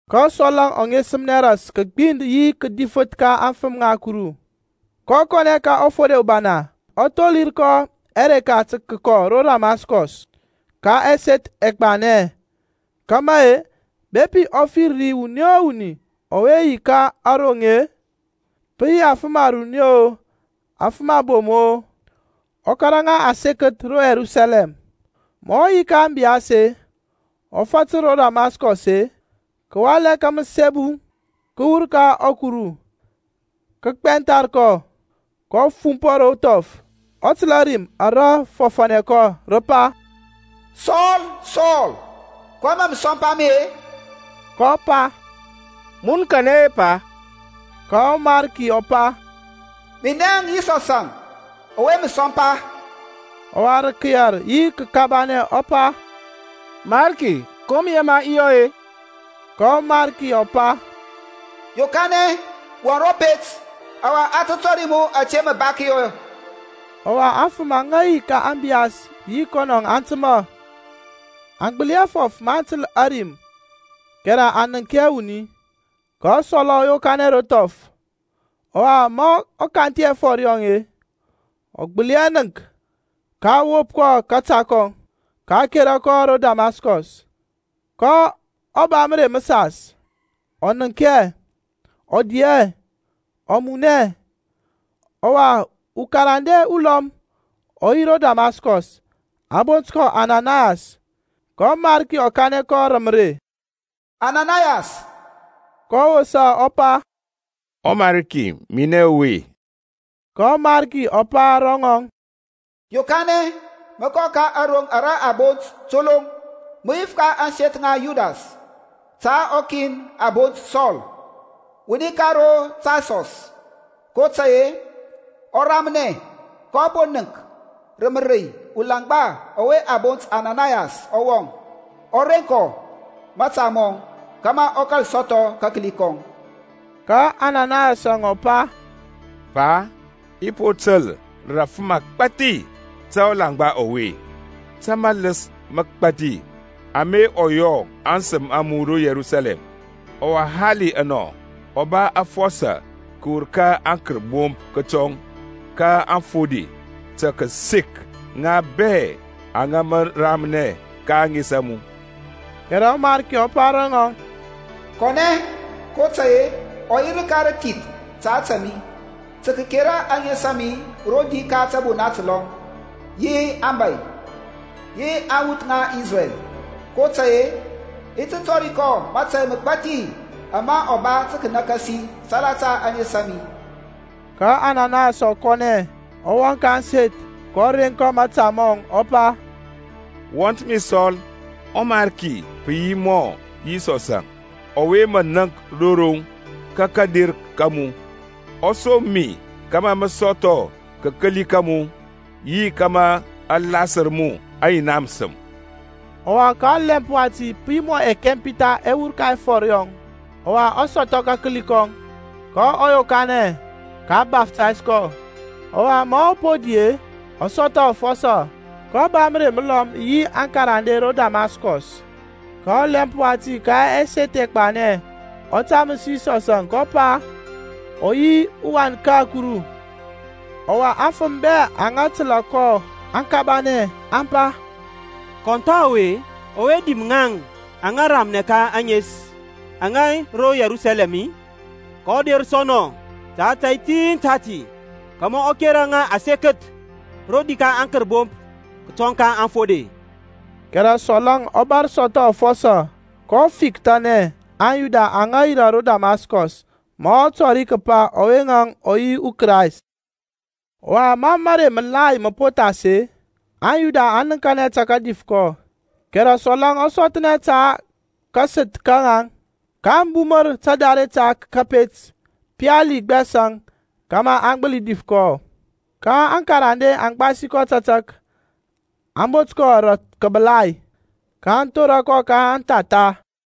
Ka Sɔl-əŋ ɔ ŋesəmnɛ ras kəgbind yi kədifəth ka aŋfəm ŋa Kuru, kɔ kɔnɛ ka ɔfode ubana, ɔ tholir kɔ ɛreka tə kəkɔ ro Damaskɔs ka ɛseth ɛgbanɛ, kama-e, bepi ɔ fir ri wuni o wuni ɔwe yi ka aRoŋ-e, pə yi afəm aruni-o, afəm abom-o, ɔ kȧrȧ ŋa asekəth ro Yerusalɛm. Ma ɔ yi ka ȧŋbiyas-e, ɔ fatər ro Damaskɔs-e, kəwalɛ ka məsembu kəwur ka ȧkuru kə gbɛnthar kɔ. kɔ fumpɔ ro thɔf, ɔ təlȧ rim ara fɔfȧnɛ kɔ, rə pa, Sɔl, Sɔl, kɔyɛŋ mȧ mə sɔmpa mi-e? kɔ pa, Mun kanɛ-e Pa? Ka ɔMarki ɔ pa, Minɛŋ Yisɔsȧŋ ɔwe mə sɔmpa. Ɔwa rə kəyɛr yi kəkabanɛ ɔ pa, Mariki ko mə yema i yɔ-e? Ka ɔMarki ɔ pa, Yokanɛ, wɔŋ ro pet, ɔwa a tə tɔri mu ȧte mə ba kəyɔ. Ɔwa aŋfəm aŋa yi ka ȧŋbiyas yi kɔnɔ aŋ təmȧ, aŋ gbəli hɛ fɔf maŋ təl ȧrim kɛrɛ aŋ nənk hɛ wuni. Ka Sɔl-əŋ ɔ yokanɛ ro thɔf; ɔwa ma a kanthi ɛfɔr yɔŋ-e, ɔ gbəli hɛ nənk. Ka a wop kɔ kȧta, a kera kɔ ro Damaskɔs. kɔ ba mərey məsas ɔ nənk hɛ, ɔ di hɛ, ɔ mun hɛ. Ɔwa ukarande ulɔm ɔ yi ro Damaskɔs, a bont kɔ Ananayas, ka ɔMarki ɔ kanɛ kɔ rə mərey, Ananayas, kɔ wosa ɔ pa, ƆMariki minɛ ɔwe. Ka ɔMarki ɔ pa ro ŋɔŋ, Yokanɛ, mə kɔ ka aroŋ ara a bont Toloŋ, mə yif ka ȧŋseth ŋa Yudas ta ukin a bont Sɔl, wuni ka ro Tarsɔs, kotȧy-e ɔ ramnɛ. kɔ po nənk rə mərey ulaŋgba ɔwe a bont Ananayas ɔ wɔŋ, ɔ reŋ kɔ mȧta mɔŋ kȧmȧ ɔ kȧl sɔthɔ kakəli kɔŋ. Ka Ananayas ɔ pa, Pa, i po təl rə afəm agbȧthi ta ɔlaŋgba ɔwe, ta maləs məgbathi ama ɔ yɔ aŋsəm a mu ro Yerusalɛm. Ɔwa hali anɔ ɔ ba afɔsɔ kəwur ka aŋkərbomp kətɔŋ ka aŋfode tə kəsek ŋa bɛ aŋa mə ramnɛ ka ȧŋes a mu. Kɛrɛ ɔMarki ɔ pa ro ŋɔŋ, Kɔnɛ, kotȧy-e ɔ yi rəka rəthith ta ȧtȧ mi, tə kəkera ȧŋes a mi rodi ka tȧbona təlɔm, yi abȧy, yi aŋwuth ŋa Isrɛl. kotȧy-e i ti tɔri kɔ mȧtȧy məgbathi ama ɔ ba tə kənakasi salata ȧŋes a mi. Ka Ananayas ɔ kɔnɛ, ɔ wɔŋ ka ȧŋseth, kɔ reŋ kɔ mȧta mɔŋ, ɔ pa, Wɔnt mi Sɔl, ɔMarki, pə yi mɔ Yisɔsȧŋ ɔwe mə nənk ro roŋ ka kȧder ka mu, ɔ som mi kȧmȧ mə sɔthɔ kakəli ka mu, yi kȧmȧ a lasər mu ɔYina məsəm. Ɔwa ka ɔlɛmp wati pə yi mɔ ɛkɛmpitha ɛ wur ka ɛfɔr yɔŋ, ɔwa ɔ sɔthɔ kakəli kɔŋ, ka a yokanɛ, ka a baftays kɔ. Ɔwa ma ɔ po di-e, ɔ sɔthɔ afɔsɔ. Kɔ ba mərey məlɔm yi aŋkarande ro Damaskɔs. Ka ɔlɛmp wati ka ɛseth ɛgbanɛ ɔ taməs Yisɔs, kəpa ɔ yi ɔWan ka Kuru. Ɔwa aŋfəm bɛ aŋa təlȧ kɔ aŋ kabanɛ, aŋ pa, Kɔn tha ɔwe ɔwe dim ŋaŋ aŋa ramnɛ ka ȧŋes aŋe ro Yerusalɛm-i? kɔ der sɔ nɔ ta ȧtȧy tin tati, kȧmȧ ɔ kera ŋa asekəth rodi ka aŋkərbomp kətɔŋ ka aŋfode. Kɛrɛ Sɔl-əŋ ɔ bȧr sɔthɔ afɔsɔ, kɔ fikthanɛ aŋYuda aŋa yirȧ ro Damaskɔs ma ɔ tɔri kəpa ɔwe-əŋ ɔ yi ɔKrayst. Ɔwa ma mərey məlai mə po thas-e, aŋYuda aŋ nəŋkanɛ tə kədif kɔ; kɛrɛ Sɔl-əŋ ɔ sɔthnɛ ta kasəth ka ŋaŋ. Ka aŋ bumər tadare ta kȧpet pali gbɛs-əŋ kȧmȧ aŋ gbəli dif kɔ. Ka aŋkarande aŋ gbasi kɔ tȧtȧk, aŋ bot kɔ rə kəbəlai, kaŋ thora kɔ ka anthatha.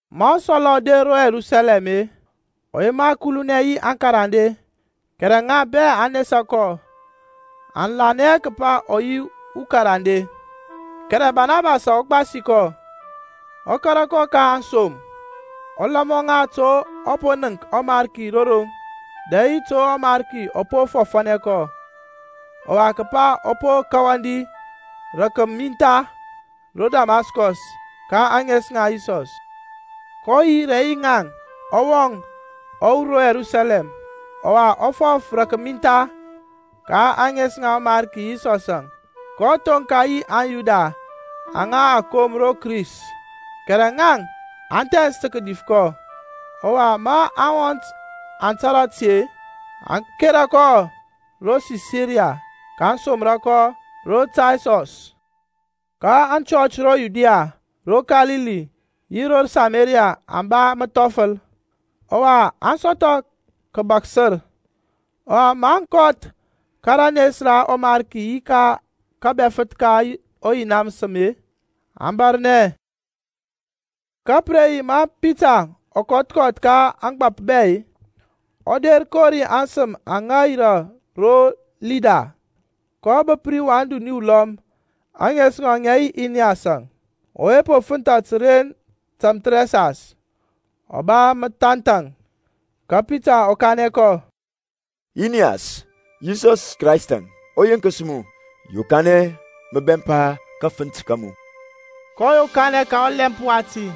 Ma Sɔl-əŋ ɔ der ro Yerusalɛm-e, ɔ yema kulunɛ yi aŋkarande, kɛrɛ ŋa bɛ aŋ nesa kɔ, aŋ lanɛ hɛ kəpa ɔ yi ukarande. Kɛrɛ Barnabas ɔ gbasi kɔ, ɔ kȧrȧ kɔ ka aŋsom, ɔ lɔma ŋa to ɔ po nənk ɔMarki ro roŋ, dɛ yi to ɔMarki ɔ po fɔfȧnɛ kɔ, ɔwa kəpa ɔ po kawandi rə kəmintha ro Damaskɔs ka ȧŋes ŋa Yisɔs. kɔ yi rɛ yi ŋaŋ, ɔ wɔŋ, ɔ wur ro Yerusalɛm, ɔwa ɔ fɔf rə kəmintha ka ȧŋes ŋa ɔMarki Yisɔsȧŋ, kɔ thoŋka yi aŋYuda aŋa a kom ro Kris; kɛrɛ ŋaŋ, aŋ thɛns tə kədif kɔ. Ɔwa ma aŋwɔnt aŋ tȧrȧ ti-e, aŋ kera kɔ ro Sisaria, kaŋ somra kɔ ro Tarsɔs. Ka aŋchɔch ro Yudia, ro Kalili yi ro Samaria aŋ ba məthɔfəl, ɔwa aŋ sɔthɔ kəbaksər. Ɔwa maŋ kɔth ka ranes ra ɔMarki yi ka kȧbɛfəth ka ɔYina məsəm-e, aŋ bȧrnɛ. Ka pə re yi ma Pitaŋ ɔ kɔth kɔth ka mȧgbȧp bɛ-e, ɔ der kori aŋsəm aŋa yirȧ ro Lida. kɔ bəp ri wan duni ulɔm, ȧŋes ŋɔŋ ŋə yi Iniyasȧŋ, ɔwe po fənthȧ təren tȧmthərɛsas, ɔ ba məthanthaŋ. Ka Pitaŋ ɔ kanɛ kɔ, Iniyas, Yisɔs Kraystȧŋ ɔ yenkəs mu. Yokanɛ mə bɛmpa kafənt ka mu. Kɔ yokanɛ ka ɔlɛmp wati.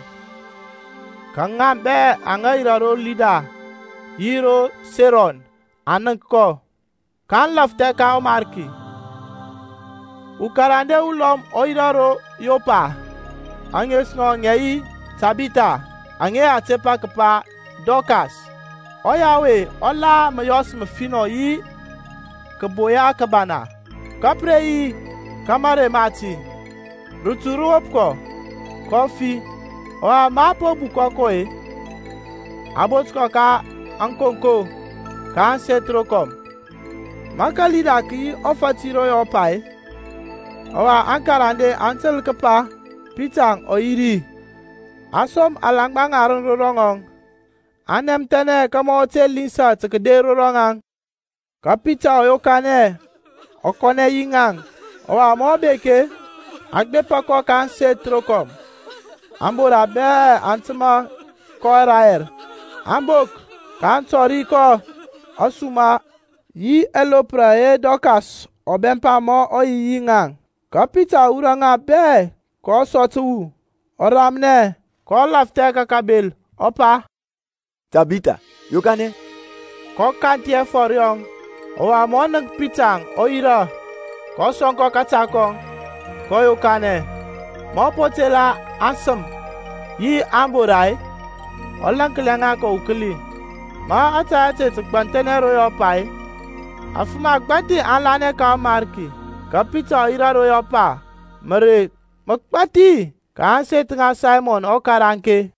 Ka ŋa bɛ aŋa yirȧ ro Lida yi ro Seron aŋ nənk kɔ, kaŋ lafthɛ ka ɔMarki. Ukarande ulɔm ɔ yirȧ ro Yɔpa, ȧŋes ŋɔŋ ŋə yi Tabitha, aŋa a tepa kəpa Dɔkas; ɔya ɔwe ɔ la məyɔs məfinɔ yi kəboya kəbana. Ka pə re yi ka marey mati, rətu rə wop kɔ, kɔ fi. Ɔwa ma a po bukɔ kɔ-e, a bot kɔ ka ȧkonko ka ȧŋseth rokɔm. Ma kaLida kə yi ɔfati yi ro Yɔpa-e, ɔwa aŋkarande aŋ təl kəpa Pitaŋ ɔ yi ri-e, aŋ som alaŋgba ŋarəŋ ro ŋɔŋ, aŋ nɛmthɛnɛ kȧmȧ ɔ te linsa tə kəder ro ŋaŋ. Ka Pitaŋ ɔ yokanɛ ɔ kɔnɛ yi ŋaŋ. Ɔwa ma ɔ bek-e, aŋ gbepa kɔ ka ȧŋseth rokɔm. Ambora bɛ aŋ təmȧ kɔ rayɛr, aŋ bok, kaŋ tɔri kɔ ȧsuma yi ɛlopra ɛyɛ Dorkas ɔ bɛmpa ma ɔ yi yi ŋaŋ. Ka Pitaŋ ɔ wurɔ ŋa bɛ kɔ sɔ təwu, ɔ ramnɛ; kɔ lafthɛ ka kabel, ɔ pa, Tabitha, yokanɛ. Kɔ kanthi ɛfɔr yɔŋ; ɔwa ma ɔ nənk Pitaŋ, ɔ yirȧ. kɔ sɔŋ kɔ kȧta kɔŋ, kɔ yokanɛ. Ma ɔ po tela aŋsəm yi ȧŋbora-e, ɔ laŋklia ŋa kɔ ukəli. Ma ȧtȧy ȧte tə gbanthɛnɛ ro Yɔpa-e, afəm agbȧthi aŋ lanɛ ka ɔMarki. Ka Pitaŋ ɔ yirȧ ro Yɔpa mərey məgbathi ka ȧŋseth ŋa Saymɔn ɔkaraŋke.